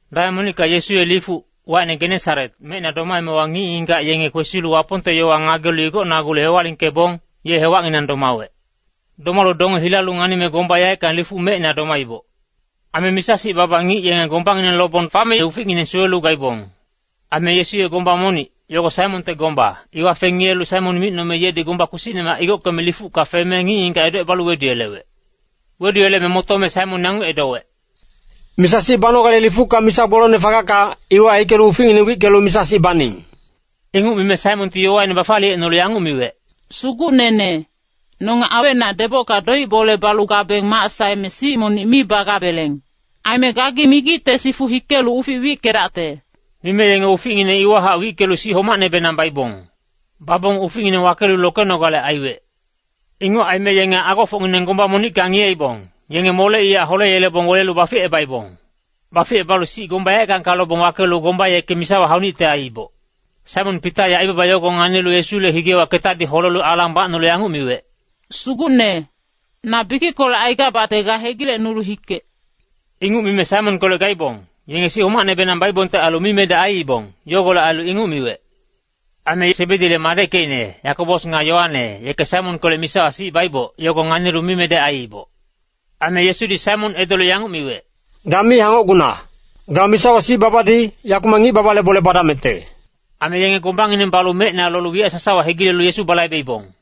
Dameng monicka Yesu ye lifuc, wacine Genesaret, mecina domaemewa ngic-ngigac yenge kwesilu Wapongte yowa ngagelu igocnagulu hewalingkebong, ye hewacnginang domawec. Domalu donge hilalu nganime gomba yaeckang lifuc mecina domaiboc. Aime misa-sic baba ngic yenge gombangineng lobong fame uficngineng suwelu gaibong. Aime Yesu ye gomba monic, yogo Saimonte gomba, iwa fengiyelu Saimon micnome yedi gomba kpisicnemac igockeme lifucka feme, ngic-ngigac edocebalu weduyelewec. Weduyeleme motome Saimon yanguc edowec, “Misa-sic banogale lifucka misa gbolongne fagacka, iwa hikelu uficngineng wickelu misa-sic baning.” Inguc mime Saimonti yowaine bafaliyecnolu yanguc miwec, “Sugucnene, nonge awecnac debocka doic-bole balu gabeng mac saeme sic monic mi bagabeleng. Aime gagi migicte sifu hikelu ufic wickedacte.” Mime yenge uficngineng iwahac wickelu sic homacnebenang baibong. Babong uficngineng wakelu lokenogale aiwec. Inguc aime yenge agofocngineng gomba monicka ngiyeibong, yenge moleiyac holeyelebong welelu baficebaibong. Baficebalu sic gomba yaeckangka lobong wakelu gomba yeke misawa haunicte aiiboc. Saimon Pita ye aibaba yogo nganilu Yesule higewa ketadi holelu alang bacnolu yanguc miwec, “Sugucne, na bikickolec aigabacte ga hegilecnulu hikec!” Inguc mime Saimonkolec gaibong, yenge sic homacnebenang baibongte ailu mimedec aiibong, yogolec ailu inguc miwec. Aime Sebedi madeckecine, Yakobos nga Yoane, yeke Saimonkolec misawa sic baiboc, yogo nganilu mimedec aiiboc. Aime Yesudi Saimon edolu yanguc miwec, “Ga mi hangocguna! Ga misawa sic babadi, yakumac ngic-baba bole badamecte.” Aime yenge gombangineng balu mecina lolu wiyac sasawa hegilelu Yesu balaibeibong.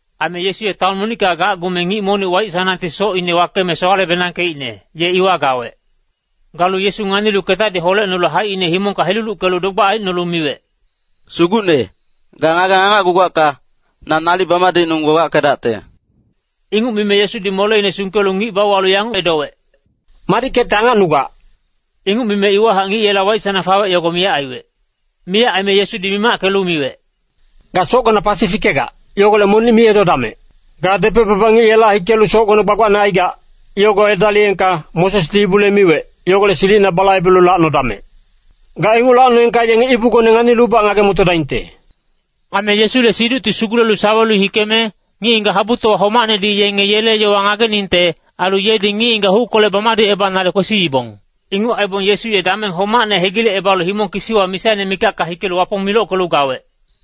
Aime Yesu ye taon monicka gacgume ngic monic waic-sanangti socine wakeme sowale-benangkeicne, ye iwa gawec. Galu Yesu nganilu ketadi holecnolu haicine himongka heluluckelu dogbac aicnolu miwec, “Sugucne, ga ngageng angacgugacka, na nalic bamadicnung gbagbackedacte.” Inguc mime Yesudi moleine sungkelu ngic bauwalu yanguc edowec, “Madickecte angacnugac.” Inguc mime iwahac ngic yela waic-sanang fawec, yogo miyac aiwec. Miyac aime Yesudi mimackelu miwec, “Ga socgona pasi fikegac, yogolec monic mi edodamec. Ga depec-baba ngic yela hikelu socgone gbagbacne aigac, yogo edaliyengka, Mosesdi ibule miwec, yogolec silicina balaibelu lacnodamec! Ga inguc lacnoengka yenge ibugone nganilubac ngage-motodaingte.” Aime Yesule siducti sugulelu sawelu hikeme, ngic-ngigac habutowa homacnedi yenge yele yowa ngageningte, ailu yedi ngic-ngigac huckolec bamadicebanale kwesiibong. Inguc aibong Yesu ye dameng homacne hegilecebalu himong kisiwa misaine mikacka hikelu Wapong milockelu gawec.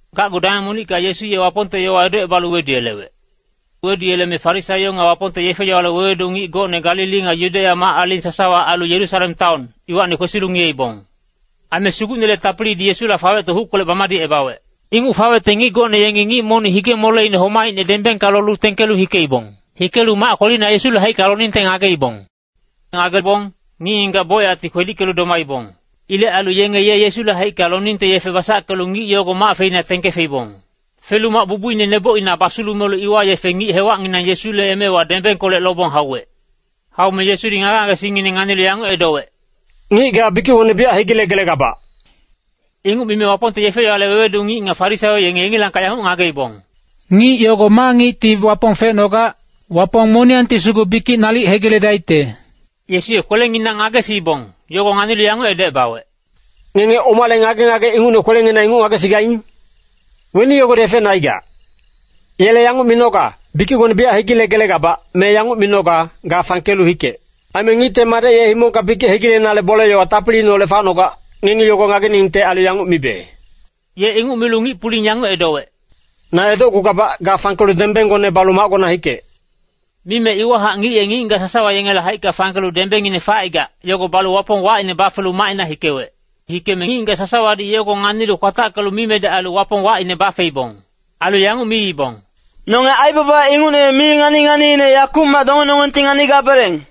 Gacgu dameng monicka Yesu ye Wapongte yowa edocebalu weduyelewec. Weduyeleme Farisaio nga Wapongte yefe-yowale wewedu ngic gocne Galili nga Yudeya mac-aling sasawa ailu Yerusalem taon, iwacni kwesilu ngiyeibong. Aime Sugucnele tapilidi Yesula fawecte huckolec bamadicebawec. Inguc fawecte ngic gocne yengi ngic monic hige-moleine homaicne dembengka lolu tengkelu hikeibong. Hikelu mac kwelina Yesule haicka loningte ngageibong. Ngagebong, ngic-ngigac bocyacti kwedickelu domaibong. Ilec ailu yenge ye Yesule haicka loningte yefe basackelu ngic yogo mac feina tengke feibong. Felu mac bubuine nebocina basulumelu, iwa yefe ngic hewacnginang Yesule emewa dembengkolec lobong hauwec. Haume Yesudi ngage-ngagesingngineng nganilu yanguc edowec, “Ngic ga, bikicgone biyac hegilegelegabac.” Inguc mime Wapongte yefe-yowale wewedu ngic nga Farisaio yenge yengilangkac yanguc ngageibong, “Ngic yogo ma ngicti Wapong fecnogac? Wapong moniyangti sugu bikic nalic hegiledaicte.” Yesu ye kwelenginang ngagesiibong, yogo nganilu yanguc edocebawec, “Ngenge omale ngage-ngage ingucne kwelenginang inguc ngagesigaing? Weni yogodi efecne aigac? Yele yanguc minoga, ‘Bikicgone biyac hegilegelegabac’, me yanguc minoga, ‘Ga fangkelu hikec.’ Aime Ngicte Madec ye himongka bikic hegilenale bole-yowa tapiliineholec facnogac, ngengi yogo ngageningte ailu yanguc mibe.” Ye inguc milu ngic-puling yanguc edowec, “Na edocgugabac, ga fangkelu dembenggone balu macgona hikec.” Mime iwahac ngic ye ngic-ngigac sasawa yengele haicka fangkelu dembengine facaigac, yogo balu Wapong wacine bafelu macina hikewec. Hikeme ngic-ngigac sasawadi yogo nganilu kwatackelu mimedec ailu Wapong wacine bafeibong. Ailu yanguc miibong, “Nonge aibaba ingucne mi ngani-nganiine yakumac dongenonggengti nganigabeleng.”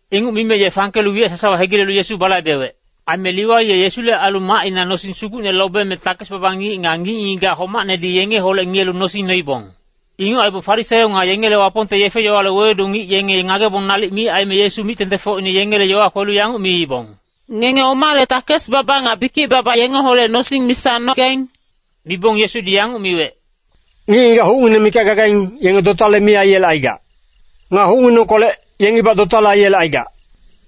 Inguc mime ye fangkelu wiyac sasawa hegilelu Yesu balaibelu hikewec. Aime Liwai ye Yesule ailu macina nosing sugucne lobeme takes-baba ngic nga ngic-ngigac homacnedi yengeholec ngiyelu nosing noibong. Inguc aibong Farisaio nga yengele Wapongte yefe-yowale wewedu ngic yenge ngagebong nalic mi aime, Yesu mic-tengtengfocine yengele yowa kwelu yanguc miibong, “Ngenge omale takes-baba nga bikic-baba yengeholec nosing misa nogaing?” Mibong Yesudi yanguc miwec, “Ngic-ngigac hucngineng mikac gagaing, yenge dotale mi aiyelecaigac. Nga hucnginengkolec, yengibac dotale aiyelecaigac.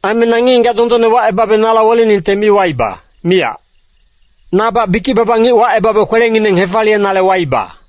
Aime na ngic-ngigac dondonne wacebabe nala weleningte mi waiba, miyac. Nabac bikic-baba ngic wacebabe kwelengineng hefaliyenale waiba.”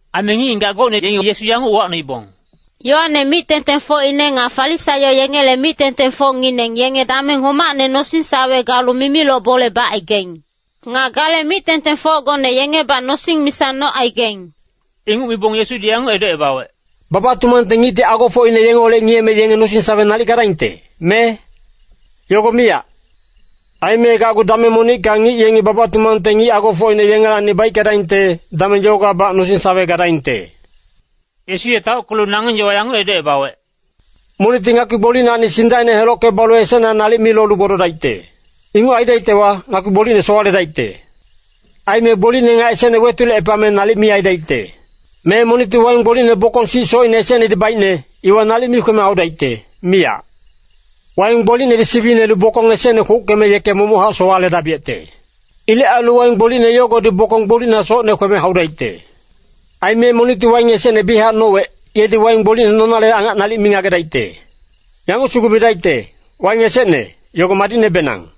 Aime ngic-ngigac gocne yengi Yesu yanguc uwacnoibong, “Yoane mic-tengtengfocine nga Farisaio yengele mic-tengtengfocngineng yenge dameng homacne nosing-sawe galu mimiloc bole bacaigaing. Nga gale mic-tengtengfocgone yengebac nosing misa nocaigaing.” Inguc mibong Yesudi yanguc edocebawec, “Baba-tumangte ngicti agofocine yengeholec ngiyeme yenge nosing-sawe nalic gadaingte, me? Yogo miyac. Aime Gacgu dameng monicka ngic yengi baba-tumangte ngic agofocine yengelacni baickedaingte, dameng yogowabac nosing-sawe gadaingte.” Yesu ye taockelu nangeng yowa yanguc edocebawec, “Monicti ngakpi gbolicnacni sindacine helocke balu esecna nalic mi lolu gbododaicte. Inguc aidaictewa, ngakpi gbolicne sowaledaicte. Aime gbolicne nga esecne wetulecepame nalic mi aidaicte. Me monicti waing gbolicne bokong sic socine esecnedi baicne, iwa nalic mi kweme haudaicte, miyac. Waing gbolicnedi siwinelu bokong esecne kwouckeme yeke momochac sowaledabiyecte. Ilec ailu waing gbolicne yogodi bokong gbolicna socne kweme haudaicte. Aime monicti waing esecne biyachac nowec, yedi waing gbolicne nonale angac nalic mi ngagedaicte. Yanguc sugu midaicte, ‘Waing esecne, yogo madicnebenang.’”